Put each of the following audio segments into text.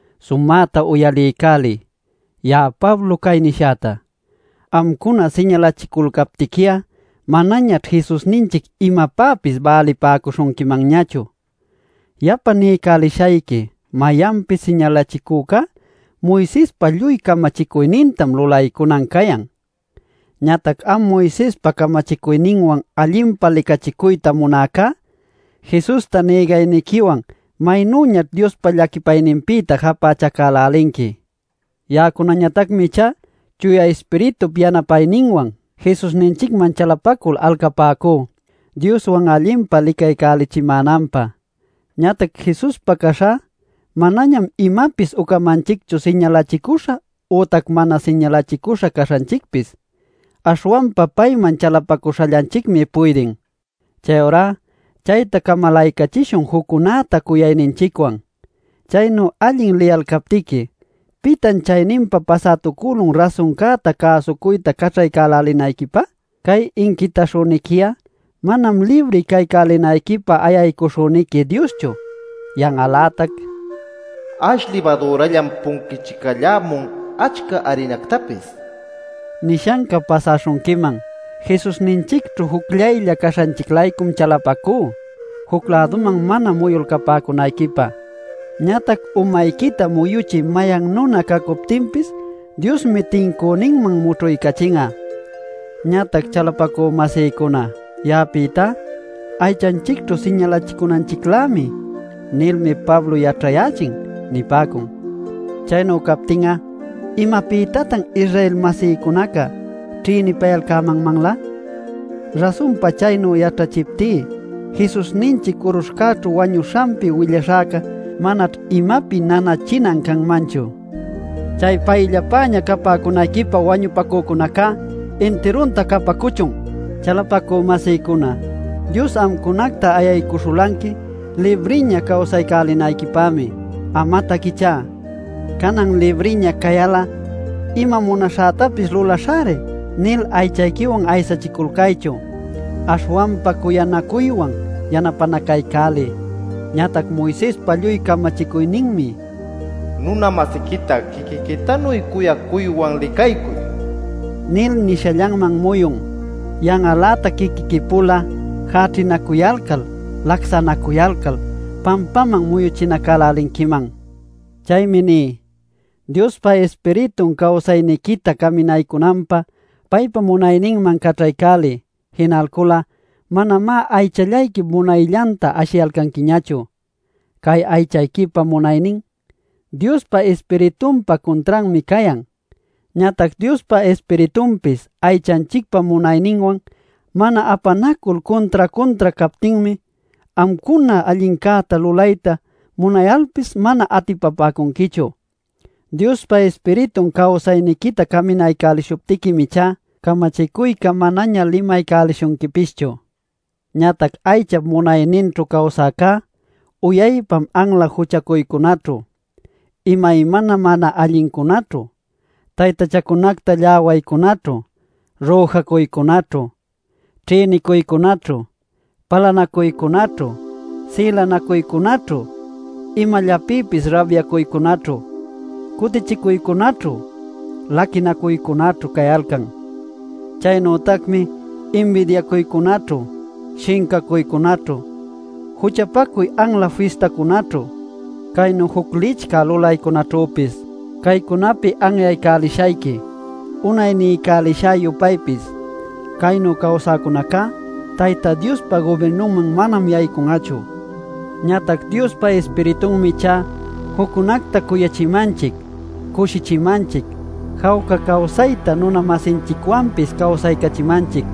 Sumäta uyaliycäliy ya'a Pablo cay nishäta: Amcuna siñalachiculcaptiqui'a manañaćh Jesusninchic imapäpis bälipäcuśhunquiñachu. Yapa niycälishayqui mayanpis siñalachicücá Moisespa lluy camachicuynintam lulaycunan cayan. Ñatac am Moisespa camachicuyninwan allinpa licachicuyta munäcá, Jesusta nïgayniquiwan ¡maynüñaćh Diospa llaquipayninpïta japächacälälinqui! Ya'acunañatacmi ichá Chuya Ispiritup yanapayninwan Jesusninchicman chalapacul alcapäcú Dioswan allinpa licaycälichimänanpä. Ñatac Jesuspa caśhá manañam imapis ucamanchicchu siñalachicüśha ütac mana siñalachicüśha caśhanchicpis; aśhwanpa payman chalapacuśhallanchicmi puydin. Chayurá chayta camalaycachishun juccunäta cuyayninchicwan. Chaynu allin liyalcaptiqui, ¿pitan chayninpa pasätucülun rasuncäta cäsucuyta caćhaycälälinayquipä? Cay inquitaśhüniqui'a manam libri caycälinayquipä ayaycuśhüniqui Dioschu. Yan'al-lätac “Ash libadürallam punquichicallämun achca arinactapis” nishanca pasäśhunquiman. Jesusninchicćhu jucllaylla caśhanchic-laycum chalapacú juc-läduman mana muyulcapäcunayquipä. Ñatac umayquita muyuchï mayan nuna cacuptinpis Diosmi tincüninman mućhuycachin'a. Ñatac, chalapacü-masïcuna, ya'apïtá: “ ‘aychanchicćhu siñalachicunanchiclämi’ nilmi Pablo yaćhayächin” nipäcun. Chaynu captin'a ¿imapïtatan Israel-masïcunaca ćhïnipayalcämanlä? Rasunpa chaynu yaćhachiptí, Jesusninchic curuśhcäćhu wañuśhanpi willaśhäca manaćh imapi nanachinan canmanchu. ¡Chay payllapäña capäcunayquipä wañupacuyäcunaca intirunta capacuchun! Chalapacü-masïcuna Dios amcunacta ayaycuśhulanqui libriña cawsaycälinayquipämi. Amatac ichá: “Canan libriña cayal'a ima munaśhätapis lulaśhäri” nil aychayquiwan aysachiculcaychu; aśhwanpa cuyacuywan yanapänacaycäliy. Ñatac Moisespa lluy camachicuyninmi “Nuna-masiquita quiquiquitanuy cuyacuywan licaycuy” nil nishallanman muyun. Yan'al-lätac quiquiqui-pula jäćhinacuyalcal, lacsanacuyalcal, pampaman muyuchinacälälinquiman. Chaymi ní: Diospa Ispiritun cawsayniquita caminaycunanpä paypa munayninman caćhaycäliy; jinalcul'a manamá aychallayquip munayllanta ashiyanquiñachu. Cay aychanchicpa munaynin, Diospa Ispiritunpa cuntranmi cayan. Ñatac Diospa Ispiritunpis aychanchicpa munayninwan mana apanacul cuntra-cuntra captinmi amcuna allincäta lulayta munayalpis mana atipapäcunquichu. Diospa Ispiritun cawsayniquita caminaycälishuptiquim ichá camachicuyca manaña limaycälishunquipischu. Ñatac aychap munayninćhu cawsäcá uyaypam anla juchacuycunaćhu, imaymana mana allincunaćhu, taytachacunacta lläwaycunaćhu, rüjacuycunaćhu, ćhïnicuycunaćhu, palanacuycunaćhu, sïlanacuycunaćhu, imallapïpis rabyacuycunaćhu, cutichicuycunaćhu, laquinacuycunaćhu cayalcan. Chaynütacmi inbidiacuycunaćhu, shincacuycunaćhu, juchapacuy anla fistacunaćhu, caynu juc licchä lulaycunaćhüpis. Caycunapi anyaycälishayqui, unay niycälishä-yupaypis, caynu cawsäcunacá Tayta Diospa gubirnunman manam yaycun'achu. Ñatac Diospa Ispiritunmi ichá juccunacta cuyachimanchic, cushichimanchic, jawca cawsayta nuna-masinchicwanpis cawsaycachimanchic.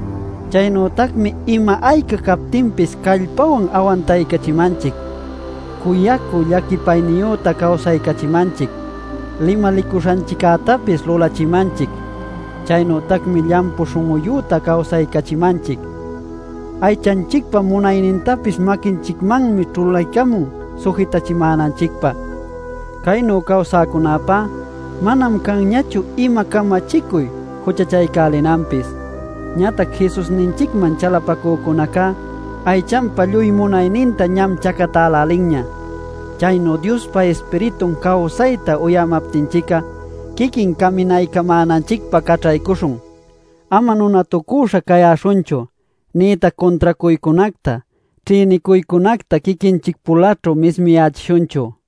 Chaynütacmi ima ayca captinpis callpawan awantaycachimanchic; cuyacü llaquipayniyüta cawsaycachimanchic; limalicuśhanchiccätapis lulachimanchic. Chaynütacmi llampu śhun'uyüta cawsaycachimanchic. Aychanchicpa munaynintapis maquinchicmanmi ćhulaycamun sujitächimänanchicpä. Caynu cawsäcunäpá manam canñachu ima camachicuy juchachaycälinanpis. Ñatac Jesusninchicman chalapacücunaca aychanpa lluy munayninta ñam chacatälälinña. Chaynu Diospa Ispiritun cawsayta uyämaptinchic'a, quiquin caminaycamänanchicpä caćhaycuśhun. Ama nunatucüśha cayäśhunchu, nïtac cuntracuycunacta, ćhïnicuycunacta quiquinchic-pulaćhu mismiyächishunchu.